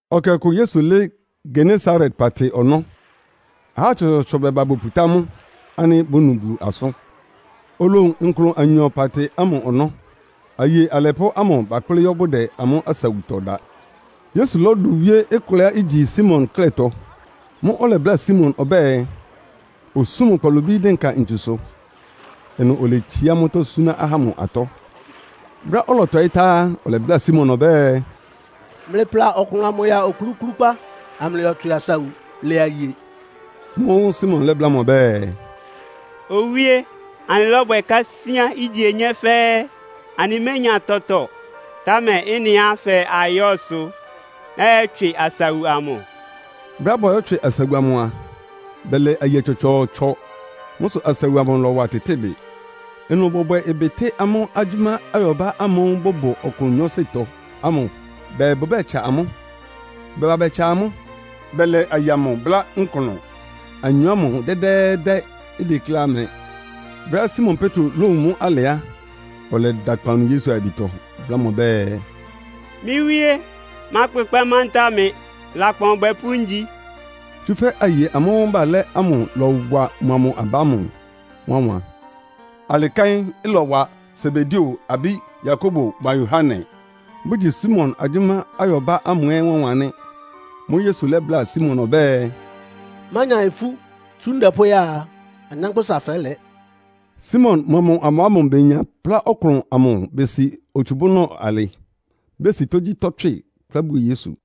Ɛkɛ ɔkʋ Yesu lɩ́ɩ́ Genesaret paatɩ ɔnɔ́, ahá tsɔtsɔɔtsɔ bɛba boputá mʋ ánɩ́ bónu Bulu asʋ́n. Olowun nklʋn anyɔ paatɩ ámʋ ɔnɔ́. Aye alɛpʋ́ ámʋ bakplɩ́ yɔ́ bʋdɛ amʋ́ asawutɔ da. Yesu lɔ́dʋ wíé kʋlɛá igyi Simon klɛ́tɔ. Mʋ́ʋ́ ɔlɛbláa Simon ɔbɛ́ɛ, osún mʋ́ kpalobí dɩnka ntsusʋ. Ɩnʋ oletsiá mʋ́tɔ́ súná ahá ámʋ atɔ́. Brɛ́á ɔlɔtɔɩ́ tá á, ɔlɛbláa Simon ɔbɛ́ɛ, “Mlɩpla ɔklʋn amʋ ya okluklúkpá, amlɩyɔtswɩ asawu lɛ aye.” Mʋ́ʋ́ Simon lɛ́bláa mʋ ɔbɛ́ɛ, “Owíé, anɩlɔ́bwɛ kásíán ígye onyé fɛ́ɛ́, anɩménya tɔtɔ. Támɛ ɩ́nɩá fɛɛ ayɔ́, sʋ nɔ́yɔtswɩ asawu amʋ.” Brɛ́á bɔyɔ́tswɩ asawu amʋ a, bɛlɛ aye tsɔtsɔɔtsɔ. Mʋ́ sʋ asawu amʋ lɔ́wa tɩtɩ́ɩ bɩ. Ɩnʋ bɔbwɛ ɩbɩ tɩ́ amʋ́ agyʋ́má ayɔbá ámʋ́ʋ́ bʋbʋ ɔklʋn nyɔɔsɩtɔ ámʋ bɛɛ bʋbɛ́tsa amʋ́. Bɛba bɛtsa amʋ́, bɛlɛ aye amʋ bʋ́lá nklʋn anyɔ ámʋ dɛ́dɛ́ɛ́dɛ́, ideklé ɩmɛ. Brɛ́á Simon Petro lówun mʋ́ alɩ á, ɔlɛda akpawunu Yesu ayabitɔ, bláa mʋ ɔbɛ́ɛ, “Mɩ́ Wíé, mákpʋkpɛ́ mantáa mɩ! Lakpan ɔbwɛpʋ́ ngyi.” Tsúfɛ́ aye amʋ́ʋ́ balɛ́ ámʋ lɔwa mʋa mʋ aba ámʋ wánwan. Alɩ kɛ́n ɩlɔwa Sebedeo abí Yakobo mʋa Yohane, bʋgyi Simon agyʋ́má ayɔbá ámʋ ɛ́ wánwan nɩ́. Mʋ́ʋ́ Yesu lɛ́bláa Simon ɔbɛ́ɛ, “Mánya ifú! Tsú ndɛ pʋ́ya a, anyánkpʋ́sa fɛ́lɛ.” Simon mʋa mʋ aba ámʋ benya plá nklʋn amʋ besi otsubúnɔ alɩ, besi tógyítɔ́ tswɩ, kplá buo Yesu.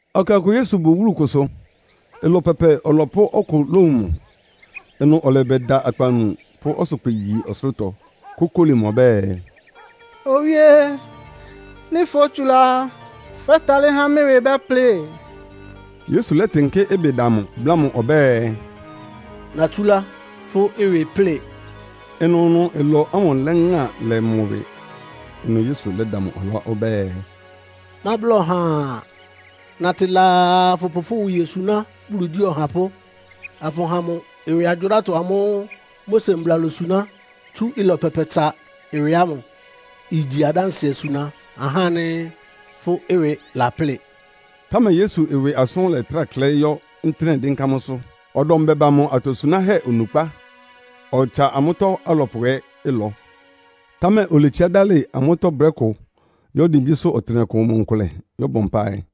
Ɛkɛ ɔkʋ Yesu bʋ wúlu kʋsʋ, ɩlɔ pɛpɛ ɔlɔpʋ́ ɔkʋ lówun mʋ. Ɩnʋ ɔlɛbɛda akpawunu, pʋ́ ɔsʋkpɩ yi ɔsʋlʋ́tɔ, kókóli mʋ ɔbɛ́ɛ, “Owíé, nɩ́ fótsulá á, fɛ́talɩ́ há mɩ́ ɩwɩ bɛ́plɩ.” Yesu lɛ́tɩnkɩ́ ɩbɩ da mʋ, bláa mʋ ɔbɛ́ɛ, “Natsúlá, fʋ́ ɩwɩ ɩplɩ́ɩ.” Ɩnʋnʋ ɩlɔ ámʋ lɛ́ŋa lɛ mʋ ɩwɩ. Ɩnʋ Yesu lɛ́da mʋ ɔlá ɔbɛ́ɛ, “Mábla ɔhaa. Natɩ laa afʋpʋ fʋ́ ɩwɩ yosuná Bulu igyí ɔhapʋ́, afʋha mʋ ɩwɩgyʋrátɔ amʋ́ʋ́ Mose mbla losuná tsú ɩlɔ pɛpɛtsa ɩwɩ ámʋ. Igyi adánsɩɛ suna ahá ánɩ́ fʋ́ ɩwɩ laplɩ́ɩ.” Támɛ Yesu ɩwɩ asʋ́n lɛ́trá klɛɩ́ yɔ́ ntɩ́nɛ́ dɩ́nká mʋ́sʋ́. Ɔdɔm bɛba mʋ atosunáhɛ́ onukpá, ɔtsa amʋ́tɔ́ alɔpʋ ɛ́ ɩlɔ. Támɛ oletsiá dálɩ amʋ́tɔ́ brɛ́ kʋ yɔ́ dimbísʋ́ ɔtɩnɛkʋ mʋ nkʋlɛ yɔ́bɔ mpáɩ.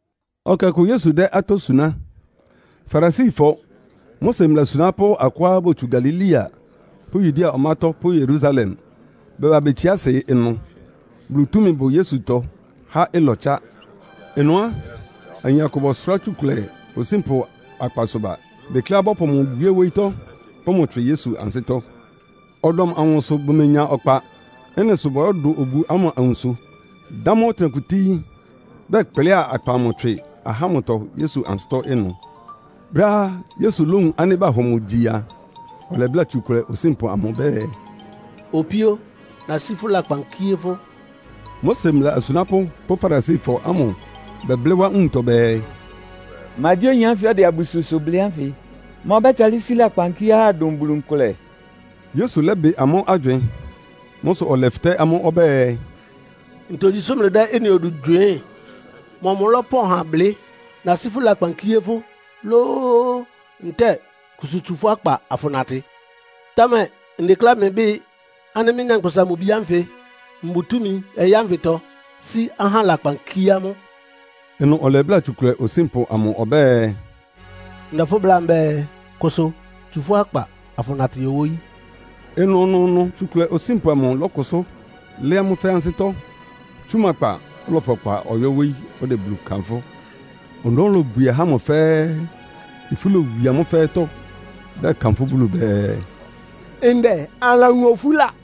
Ɛkɛ ɔkʋ Yesu dɛ́ atɔ́ suná. Farisifɔ, Mose mbla asunápʋ́ akʋá botsú Galilea pʋ́ Yudea ɔmátɔ́ pʋ́ Yerusalem bɛba betsiá asɩ ɩnʋ. Bulu túmi bʋ Yesutɔ há ɩlɔtsa. Ɩnʋ á, ayin akʋ bɔsʋrá tsukʋlɛ osínpʋ akpasʋ ba. Bekleá bɔ́pʋ mʋ wíé wóyítɔ́, pʋ́ mʋ tswɩ Yesu ansɩ́tɔ́. Ɔdɔm amʋ sʋ bʋmenya ɔkpa. Ɩ́nɩ sʋ bɔyɔ́dʋ obu ámʋ awunso, dá mʋ́ ɔtɩnɛkʋ tíí, bɛkplɩ́a akpa amʋ tswɩ ahá ámʋtɔ Yesu ansɩ́tɔ́ ɩnʋ. Brɛ́á Yesu lówun ánɩ́ bahɔ mʋ gyi a, ɔlɛbláa tsukʋlɛ osínpʋ amʋ ɔbɛ́ɛ, “Opíó, nasí fʋ́ lakpan kíé fʋ́.” Mose mbla asunápʋ́ pʋ́ Farisifɔ ámʋ bɛblɩ́ wá nwuntɔ bɛɛ, “Ma gyí oyin ánfɩ ɔdɛ abususʋ blɩ́ ánfɩ? Ma ɔbɛ́talɩ́ sí lakpan kíé ahá dʋn Bulu nkʋlɛ?” Yesu lɛ́bɩ amʋ́ agywɩɩn. Mʋ́ sʋ ɔlɛfɩtɛ́ amʋ́ ɔbɛ́ɛ, “Ntogyi sʋ́ mlɩdɛ́ ɩ́nɩ odu gywɩɩ́n? Mɔmʋ lɔ́pɔn ha blɩ́? ‘Nasí fʋ́ lakpan kíé fʋ́.’ lóó, ntɛ́ɛ ‘Kʋsʋ tsu fʋ́ akpa afʋnatɩ?’ Támɛ ndekléá mlɩbɩ́ɩ ánɩ́ mɩ́, Nyankpʋsa-Mʋ-Bi ánfɩ mbʋ túmi ɔyɩ́ ánfɩtɔ sí ahá lakpan kíé amʋ́.” Ɩnʋ ɔlɛbláa tsukʋlɛ osínpʋ amʋ ɔbɛ́ɛ, “Ndɛ fʋ́ bláa mbɛ́ɛ, kʋsʋ. Tsu fʋ́ akpa afʋnatɩ yɔ wóyí!” Ɩnʋnʋʋnʋ tsukʋlɛ osínpʋ amʋ lɔ́kʋsʋ́ lɩ́ɩ́ amʋ́ fɛ́ɛ́ ansɩ́tɔ́, tsú mʋ akpa, ɔlɔpʋ ɔkpa ɔyɔ́ wóyí ɔdɛ Bulu kanfʋ́. Ɔnɔ́ lobwie ahá ámʋ fɛ́ɛ́. Ifú lowie amʋ́ fɛ́ɛ́tɔ́, bɛkanfʋ́ Bulu bɛɛ, “Ndɛ anɩlawun ofúla!”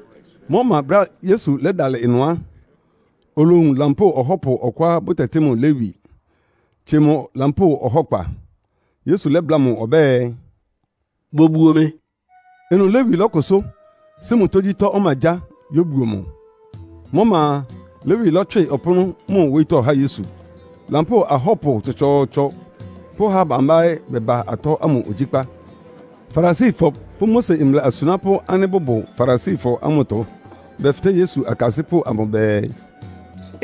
Mʋ́ ɔma brɛ́á Yesu lɛ́dalɩ ɩnʋ á, olowun lampóo ɔhɔ́pʋ ɔkʋá bʋtɛtɩ́ mʋ Lewi, tsie mʋ lampóo ɔhɔ́kpa. Yesu lɛ́bláa mʋ ɔbɛ́ɛ, “Bobuo mɩ.” Ɩnʋ Lewi lɔ́kʋsʋ́, sí mʋ tógyítɔ́ ɔmagyáa, yóbuo mʋ. Mʋ́ ɔma a, Lewi lɔ́tswɩ ɔpʋ́nʋ́ mʋ wóyítɔ́ há Yesu. Lampóo ahɔ́pʋ tsɔtsɔɔtsɔ pʋ́ aha bambá ɛ́ bɛba atɔ́ ámʋ ogyíkpá. Farisifɔ pʋ́ Mose mbla asunápʋ́ ánɩ́ bʋbʋ Farisifɔ ámʋtɔ bɛfɩtɛ́ Yesu akasɩ́pʋ́ amʋ bɛɛ,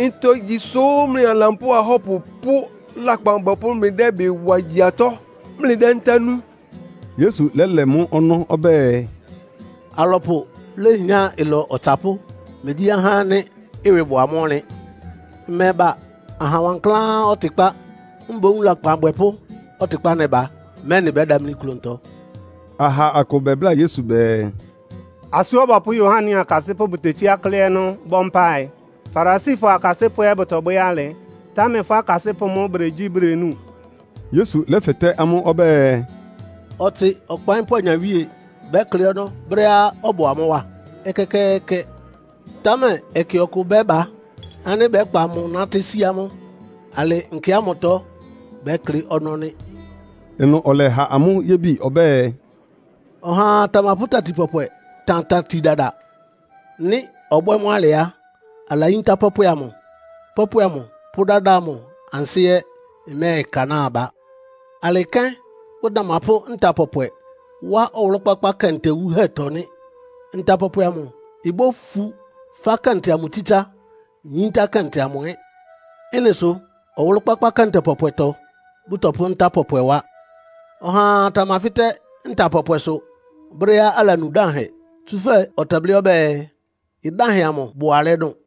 “Ntogyi sʋ́ mlɩa lampóo ahɔ́pʋ pʋ́ lakpan abwɛpʋ́ mlɩdɛ́ ɩbɩ wa gyi atɔ́, mlɩdɛ́ ntá nú?” Yesu lɛ́lɛ mʋ́ ɔnɔ́ ɔbɛ́ɛ, “Alɔpʋ léhián ɩlɔ ɔtsapʋ́, megyí ahá ánɩ́ ɩwɩ bʋ amʋ́ ɔnlɩn. Mmɛba aha wankláán ɔtɩkpá. Mboún lakpan abwɛpʋ́ ɔtɩkpá nɛba, mɛ́nɩ bɛ́damlí klʋntɔ.” Aha akʋ bɛbláa Yesu bɛɛ, “Asú Ɔbɔpʋ́ Yohane akasɩ́pʋ́ bʋtetsíá klɩ́ ɔnɔ́ bɔ́ mpáɩ. Farisifɔ akasɩ́pʋ́ ɛ́ bʋtɔbwɛ́ alɩ, támɛ fʋ́ akasɩ́pʋ́ mʋ́ bʋdegyí, bʋdenúu.” Yesu lɛ́fɩtɛ́ amʋ́ ɔbɛ́ɛ, “Ɔtsɩ ɔkpaɩ́npʋ́ anyawíe bɛ́klɩ́ ɔnɔ́ brɛ́á ɔbʋ amʋ́ wá? Ɛkɛkɛɛkɛ! Támɛ ɛkɛ ɔkʋ bɛ́ba ánɩ́ bɛ́kpa mʋ nátɩ́ sí amʋ́. Alɩ nkɛ ámʋtɔ bɛ́klɩ́ ɔnɔ́ nɩ́.” Ɩnʋ ɔlɛha amʋ́ yébi ɔbɛ́ɛ, “Ɔhaa tamapʋ́ tati pɔpwɛ tan tati dada. Nɩ́ ɔbwɛ́ mʋ́ alɩ á, alayíntá pɔpwɛ amʋ, pɔpwɛ amʋ pʋ́ dada amʋ ansɩ́ ɛ́ ɩmɛ́ɛkanáa aba. Alɩ kɛ́n bʋtamapʋ́ nta pɔpwɛ wá ɔwʋlʋ́-kpákpá kɛntɛ wuhɛ́tɔ́ nɩ́. Nta pɔpwɛ amʋ ibófu fá kɛntɛ amʋ tsítsá, yíntá kɛntɛ amʋ ɛ́. Ɩ́nɩ sʋ ɔwʋlʋ́-kpákpá kɛntɛ pɔpwɛtɔ bʋ́tɔpʋ́ nta pɔpwɛ wá. Ɔhaa tamafɩ́tɛ́ nta pɔpwɛsʋ brɛ́á alanu dánhɛ. Tsúfɛ́ ɔtɛblɩ́ ɔbɛ́ɛ, ‘Ɩdánhɛ amʋ bʋ alɛ́ dʋn.’”